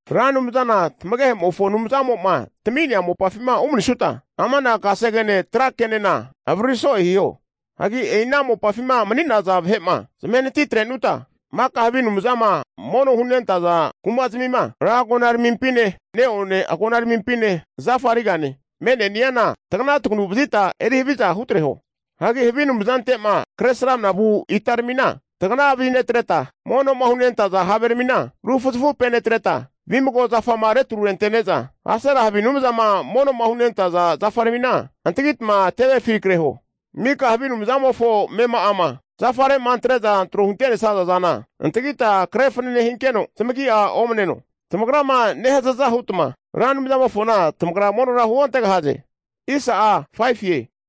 Ra Anumzana tamagehe'mofo Anumzamo'ma tami'nea mopafima umanisuta, ama'na kasegene trakenena avariri so'e hiho. Hagi e'i ana mopafima mani'naza vahe'ma zamahe natitre'nuta, maka havi anumzama mono'ma hunentaza kuma'zmima, ra agonaramimpine, neone agonaramimpine zafarigane, me'neniana tagana taganu vazita eri haviza hutreho. Hagi havi anumzante'ma Kresramanama vu itaramina tagana vazinetreta, mono'ma hunentaza haveramina rufuzafupenetreta, vimago zafama retrurente'ne'za Asera havi anumzama mono'ma hunentaza zafaramina antagitma tevefi kreho. Maka havi anumzantmimofo amema'ama zafare'ma antre'za tro'ma hunte'nesaza zana antagita kre fanane hinkeno, zamagi'a omneno. Zamagrama nehazaza hutma, Ra Anumzamofona tamagra monora huontegahaze.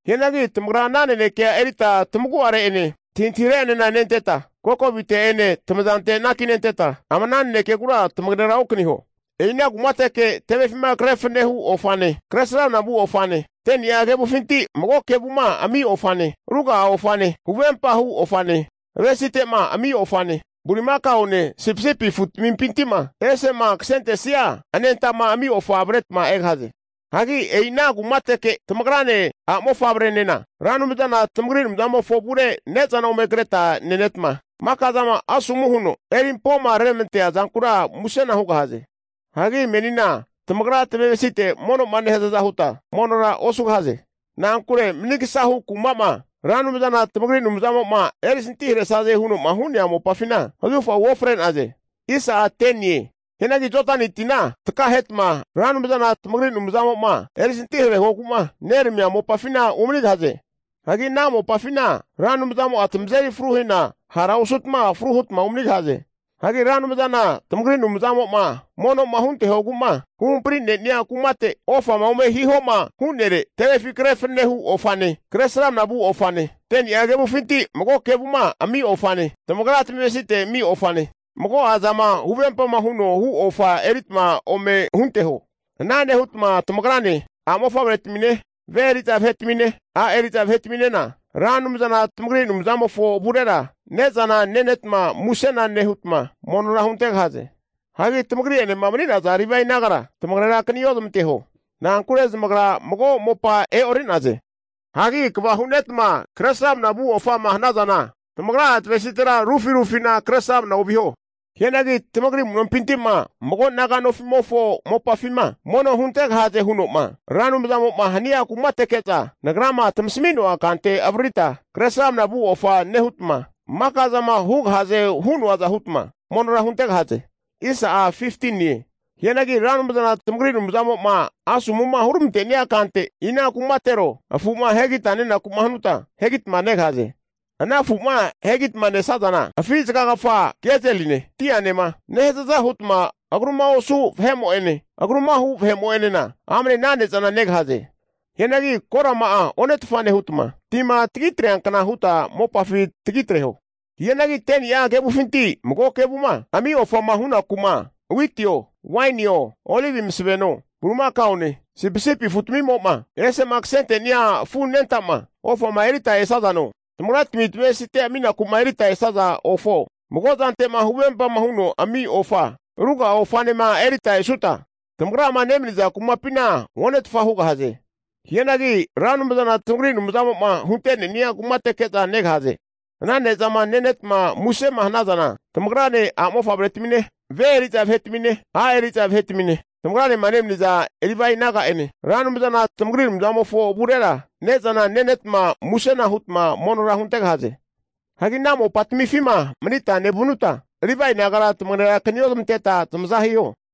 Hianagi tamagra ama nanekea erita tamagu'are'ene antahintahire'enena nenteta, kokovite'ene tamazante'ene anakinte'neta ama ana nanekegura tamagera okaniho. E'ina kumateke tevefima kre fanane hu ofane, kresramna vu ofane, 10ni'a kevufinti mago kevuma ami ofane (tait), ruga'a ofane, huvempahu ofane, avesite'ma ami ofane, bulimakaone sipisipi afutamimpinti'ma ese'ma kasentesia anenta'ma ami ofa avretma egahaze. Hagi e'i ana kumateke tamagrane a'mofavrenena Ra Anumzana tamagri Anumzamofo avure ne'zana ome kretma nenetma, maka zama asomu huno eri'ampoma reramante'nea zankura musena hugahaze. Hagi menima tamagra tamavesite mono'ma nehazaza huta, monora osugahaze. Na'ankure manigasahu kuma'ma Ra Anumzana tamagri Anumzamo'ma erisantiharesaze huno'ma hu'nea mopafina zahufa uofre'naze. Hianagi Jodani tina takahetma Ra Anumzana tamagri Anumzamo'ma erisantiharehogu'ma neramamia mopafina umanigahaze. Hagi ana mopafina Ra Anumzamo'a tamazeri fruhina hara osutma fru hutma umanigahaze. Hagi Ra Anumzana tamagri Anumzamo'ma mono'ma huntehogu'ma huhampri'nenia kumate, ofama ome hihoma hu'nere tevefi kre fananehu ofane, kresramna vu ofane, 10ni'a kevufinti mago kevuma ami ofane (tait), tamagra tamavesite ami'ofane, mago'a zama huvempama huno hu ofa eritma ome hunteho. Ana nehutma tamagrane, a'mofavretamine, ve eri'za vahetamine, a' eri'za vahetaminena, Ra Anumzana tamagri Anumzamofo avurera ne'zana nenetma musena nehutma monora huntegahaze. Hagi tamagri'enema mani'naza Livae nagara tamagerakani ozmanteho, na'ankure zamagra mago mopa e'ori'naze. Hagi kva hu'netma kresramna vu ofama hanazana, tamagra'a tamavesitera rufi rufina kresramna oviho. Hianagi tamagri amu'nompinti'ma mago naga nofi'mofo mopafima mono hunantegahaze huno'ma Ra Anumzamo'ma hania kumateke'za, nagrama tamasmi'noa kante avaririta kresramna vu ofa nehutma, maka'zama hugahazema hu'noaza hutma monora huntegahaze. Hianagi Ra Anumzana tamagri Anumzamo'ma asomu'ma huramante'nia kante ina kumatero afu'ma ahegita nenaku'ma hanutma ahegitama negahaze. Ana afu'ma ahegitama nesazana, afi zagakafama kezeline dianema nehazaza hutma agruma osu vahe'mo'ene agruma hu vahe'mo'enena amane ana ne'zana negahaze. Hianagi korama'a onetfa nehuta, tima tagitreankna huta mopafi tagitreho. Hianagi 10ni'a kevufinti mago kevuma ami ofama hunaku'ma witio, wainio, olivi masaveno, bulimakaone sipisipi afutamimo'ma ese'ma kasente'nia afu anenta'ma ofama eritma esazano, tamagratmi tamavesite aminaku eritma esaza ofo, mago'a zante'ma huvempama huta ami ofa, ruga'a ofanema eritma esuta tamagrama nemaniza kumapina onetfa hugahaze. Hianagi Ra Anumzana tamagri Anumzamo'ma hunte'ne'nia kumateke negahaze. Ana ne'zama nenetma musema hanazana tamagrane, a'mofavretamine, ve eri'za vahetamine, a' eri'za vahetamine, tamagranema nemaniza Livae naga'enena, Ra Anumzana tamagri Anumzamofo avurera ne'zana nenetma, musena hutma monora huntegahaze. Hagi ana mopatamifima manita nevanutma, Livae nagara tamagera kaniozamanteta zamaza hiho.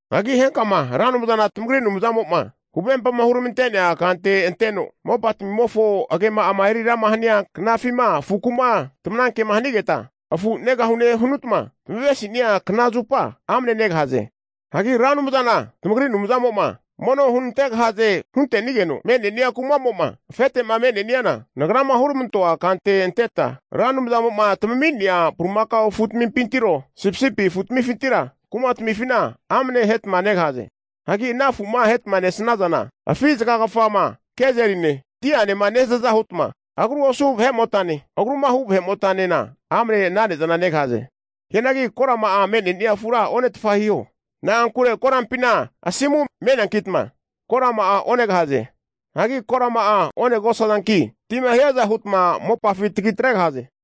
Hagi henkama Ra Anumzana tamagri Anumzamo'ma huvempama huramante'nea kante anteno, mopatmimofo agema'ama eri rama hania knafima, afuku'ma tamanankema hanigeta, afu negahune hanutma tamavemasi'nia knazupa amne negahaze. Hagi Ra Anumzana tamagri Anumzamo'ma mono hunantegahaze hunte'nigeno me'ne'nia kuma'mo'ma afete'ma me'neniana, nagrama huramante'noa kante anteta Ra Anumzamo'ma tamami'nea bulimakao afutamifintiro, sipisipi afutamifintira kumatamifina amne ahetma negahaze. Hagi ana afu'ma ahetma nesazana, afi zagakafama kezeline dianema nehazaza hutma, agruma osu vahe'motane agrumahu vahe'motanena amne ana ne'zana negahaze. Hianagi korama'a me'ne'nia afura onetfa hiho, na'ankure koranpina asimu me'neankitma, korama'a onegahaze. Hagi korama'a onegosazanki tima hiaza hutma mopafi tagitregahaze.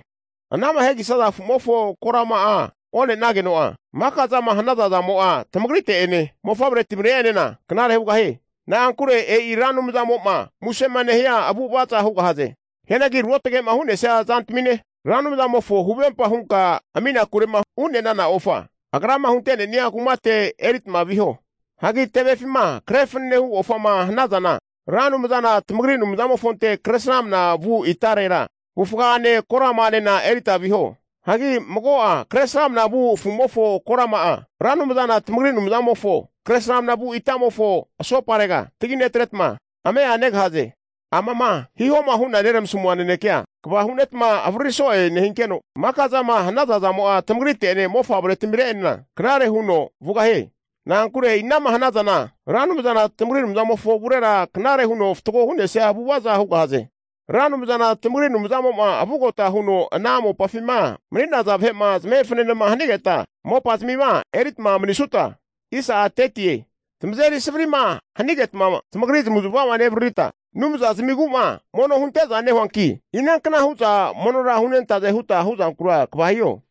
Anama ahegisaza afu'mofo korama one'nageno'a, maka zama hanazazamo'a tamagrite'ene mofavretmire'enena knare hugahie. Na'ankure e'i Ra Anumzamo'ma musema nehia avu'avaza hugahaze. Hianagi ruotage'ma hu'nesia zantamine, Ra Anumzamofo huvempa hunka aminakurema hu'ne'nana ofa, Agrama hunte'nenia kumate eritma viho. Hagi tevefima kre fanenehu ofa ome hanazana, Ra Anumzana tamagri Anumzamofonte kresramna vu itarera, avufgane korama'anena eritma viho. Hagi mago'a Kresramanama vu afu'mofo korama'a, Ra Anumzana tamagri Anumzamofo kresramna vu itamofo asoparega taginetretama, ame'a negahaze. Amama hihoma hu'na neramasmua nanekea kva hu'netma avariri so'e nehinkeno, maka zama hanaza zamo'a tamagrite'ene mofavretmire'enena knare huno vugahie. Na'ankure e'ina'ma hanazana Ra Anumzana tamagri Anumzamofo avurera knare huno fatgo hu'nesia avu'avaza hugahaze. Ra Anumzana tamagri Anumzamo'ma vugota huno ana mopafima mani'naza vahe'ma zamahe fananema hanigeta, mopazmima eritma manisutma, tamazeri savari'ma hanigetma zamagri zamavu'zamava nezmavaririta, anumza zamigu'ma mono hunte'za nehunanki inankna hu'za monora hunentaze hutama hu'zankura kva hiho.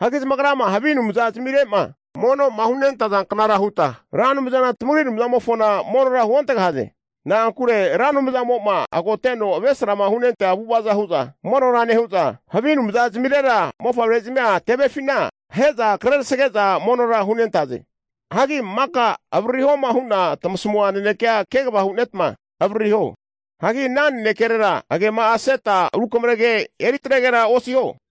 Hagi zamagrama havi anumza zamire'ma mono'ma hunentazanknara huta Ra Anumzana tamagri Anumzamofona monora huontegahaze. Na'ankure Ra Anumzamo'ma ago'mateno avesrama hunentea avu'ava hu'za monora nehu'za, havi anumza zamirera mofavrezmia tevefina ahe'za krerasage'za monora hunentaze. Hagi maka avaririhoma hu'na tamasmua nanekea kegava hu'netma avaririho. Hagi ana nanekerera agema'a aseta rukamrege eri tregera osiho.